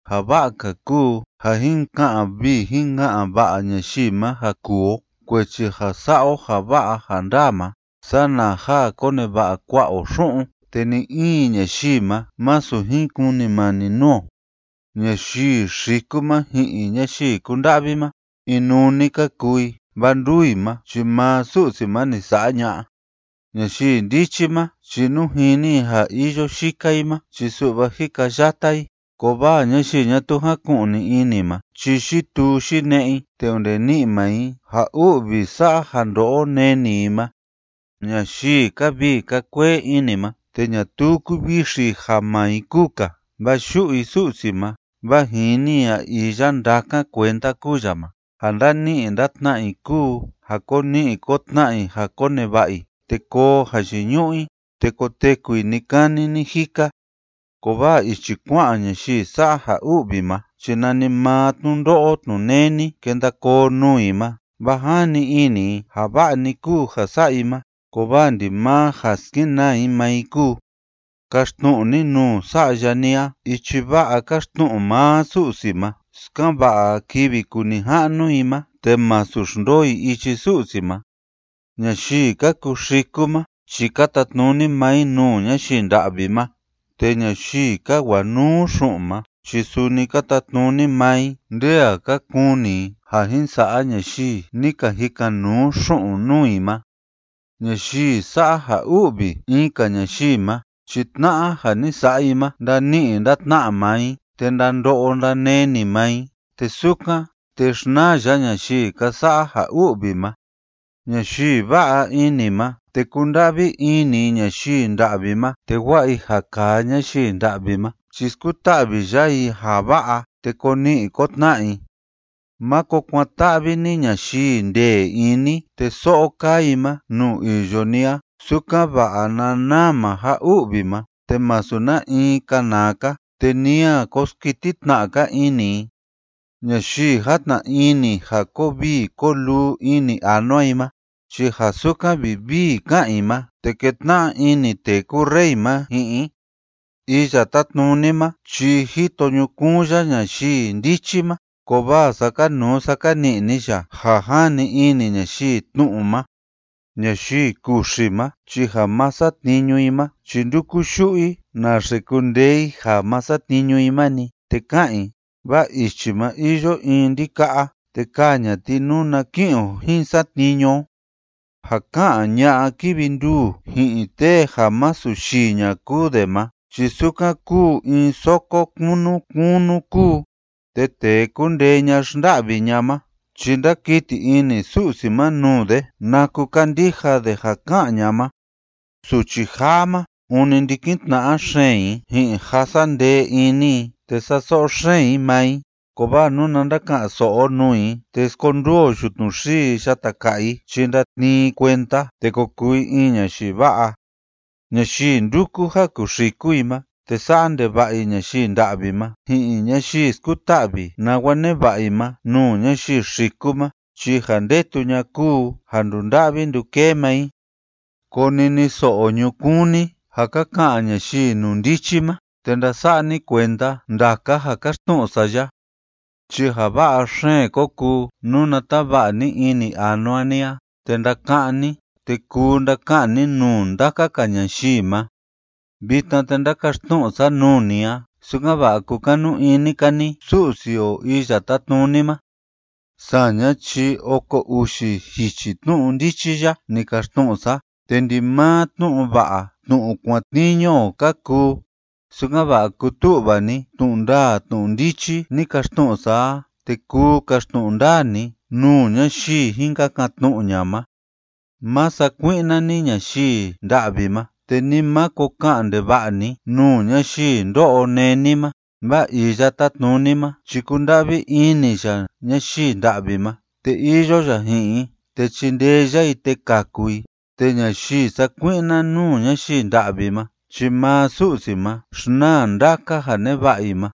Ja va'a‑ka kuu ja jin ka'an vii jin ka'an va'a ñayii ma ja kuu o kuechi ja sa'a o ja va'a ja ndaa ma sana ja koneva'a kua'a o xu'un te ni‑in ñayii ma masu jin kunimani nuu o. Ñayii xiku ma ji'in ñayii kúnda'vi ma, inuu‑ni ka kuu i, vaa nduu i ma chi maa Su'si ma ni sa'a ña'a. Ñayii ndichi ma chi nú jini i ja iyo yika i ma chi su'va jikayata i, kovaa ñayii ñatuu jáku'ni ini ma chi yituu yine'e i te onde ni'i maa i ja u'vi sa'a ja ndo'o neni i ma. Ñayii kaa vii kaa kuee ini ma te ñatuu kúvixi i ja maa i kúu‑ka vaa yu'u i Su'si ma vaa jini i ja iya ndákan kuenda kúu ya ma, ja ndani'i ndatna'a i kúu ja ko ni'i ko tna'a i ja koneva'a i, te koo jayiñu'u i, te koteku i ni‑kani ni‑jika, kovaa ichi kua'an ñayii sa'a ja u'vi ma chi nanimaa tnundo'o tnuneni kenda koo nuu i ma, vaa jani ini i ja va'a‑ni kúu ja sa'a i ma, kovaa ndimaa ja skenaa i maa i kúu. Kaxtnu'u ni nuu sa'ya ni a ichi va'a káxtnu'u maa Su'si ma, sukan‑va'a kivi kuu nija'nu i ma te masu xndoo i ichi Su'si ma. Ñayii ka kuxiku ma chi ka tatnuni maa i nuu ñayii nda'vi ma, te ñayii ka wanuu xu'un ma chi suni ka tatnuni maa i nde a ka kuni i ja jin sa'a ñayii ni ka jikan‑nuu xu'un nuu i ma. Ñayii sa'a ja u'vi in‑ka ñayii ma chi tna'a ja ni sa'a i ma ndani'i ndatna'a maa i, te ndando'o ndaneni maa i, te sukan, te xnaa ya ñayii ka sa'a ja u'vi ma. Ñayii va'a ini ma te kúnda'vi ini i ñayii nda'vi ma te wa'a i ja kaa ñayii nda'vi ma chi skuta'vi ya i ja va'a te ko ni'i ko tna'a i. Máko kuan‑ta'vi ni ñayii ndee ini te so'o kaa i ma nuu iyo ni a, sukan‑va'a na naa maa ja u'vi ma te masu na in kanaa‑ka, te ni a ko skiti tna'a‑ka ini i. Ñayii játna ini ja koo vii koo luu ini anua i ma, chi ja sukan vivii ká'an i ma, te ketna'a ini tee kúu rey ma ji'in i. Iya Tátnuni ma chi jito ñukuun ya ñayii ndichi ma, kovaa sákanuu sákani'ni ya ja jani ini ñayii tnu'u ma. Ñayii kuxi ma chi ja ma satniñu i ma chi ndúku yu'u i naxe kundee i ja ma satniñu i ma‑ni, te ká'an i: “Vaa ichi ma iyo in ndika'a, te kaa ña'a ti nuna ki'in o jin satniñu o.” Ja ká'an ña'a kívi nduu ji'in tee ja masu yii ña kúu de ma chi sukan kúu in soko kunu kunu kúu, te tee kúndee ña xnda'vi ña ma chi ndákiti ini Su'si ma nuu de naku kándija de ja ká'an ña ma. Suchi jaa ma ûni ndikin tna'a xeen i ji'in ja sa'a ndee ini i te sa'a so'o xeen i maa i, kovaa nuna ndaka'an‑so'o o nuu i te skonduu o yutnu xii yata ka'a i chi ndatnii i kuenda te ko kuu i in ñayii va'a. Ñayii ndúku ja kuxiku i ma te sa'a ndeva'a i ñayii nda'vi ma ji'in ñayii skuta'vi nawa neva'a i ma nuu ñayii xiku ma, chi ja ndetu ña'a kúu ja ndunda'vi ndukee maa i. Koniniso'o ñukuun ni ja ka ka'an ñayii inundichi ma te ndasa'a ni kuenda ndaka ja káxtnu'u sa ya. Chi ja va'a xeen ko kuu nuna tava'a ni ini anua ni a te ndaka'án ni te kuu ndaka'an ni nuu ndaka‑ka ñayii ma. Vitna te ndákaxtnu'u sa nuu ni a, sukan‑va'a kukanu ini‑ka ni Su'si o Iya Tátnuni ma. Saña chi oko uxi jichi tnu'u ndichi ya ni kaxtnu'u sa, te ndimaa tnu'u va'a tnu'u kuatniñu o ka kuu, sukan‑va'a kutu'va ni tnu'u ndaa tnu'u ndichi ni kaxtnu'u sa a, te kuu kaxtnu'u ndaa ni nuu ñayii jin kakan‑tnu'u ña'a ma. Má sakui'na ni ñayii nda'vi ma te ni máko ka'an ndeva'a ni nuu ñayii ndó'o néni ma, vaa Iya Tátnuni ma chi kúnda'vi ini ya ñayii nda'vi ma te iyo ya ji'in i te chindee ya i te kaku i, te ñayii sakui'na nuu ñayii nda'vi ma chi maa Su'si ma xnaa ndaka ja neva'a i ma.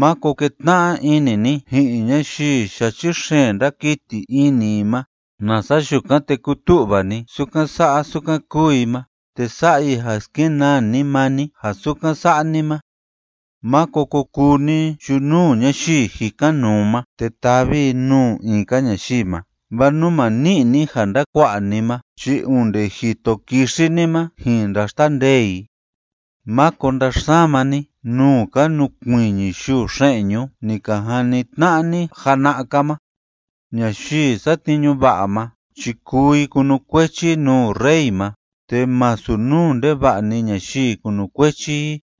Máko ketna'a ini ni ji'in ñayii yachi xeen ndákiti ini i ma, nasa yukan te kutu'va ni sukan sa'a sukan kúu i ma, te sa'a i ja skenaa ni maa ni ja sukan sa'a ni ma. Máko ko kuu ni yunuu ñayii jikan‑nuu ma te tavi i nuu in‑ka ñayii ma, vaa nú ma ni'i ni ja ndakua'a ni ma chi onde jito kixi ni ma jin ndaxtandee i. Máko ndaxsama ni nuu ka nukuiñi yuu xe'ñu ni ka jani tna'a ni jana'a‑ka ma. Ñayii satniñu va'a ma chi kuu i kunukuechi i nuu rey ma, te masu nuu ndeva'a‑ni ñayii kunukuechi i.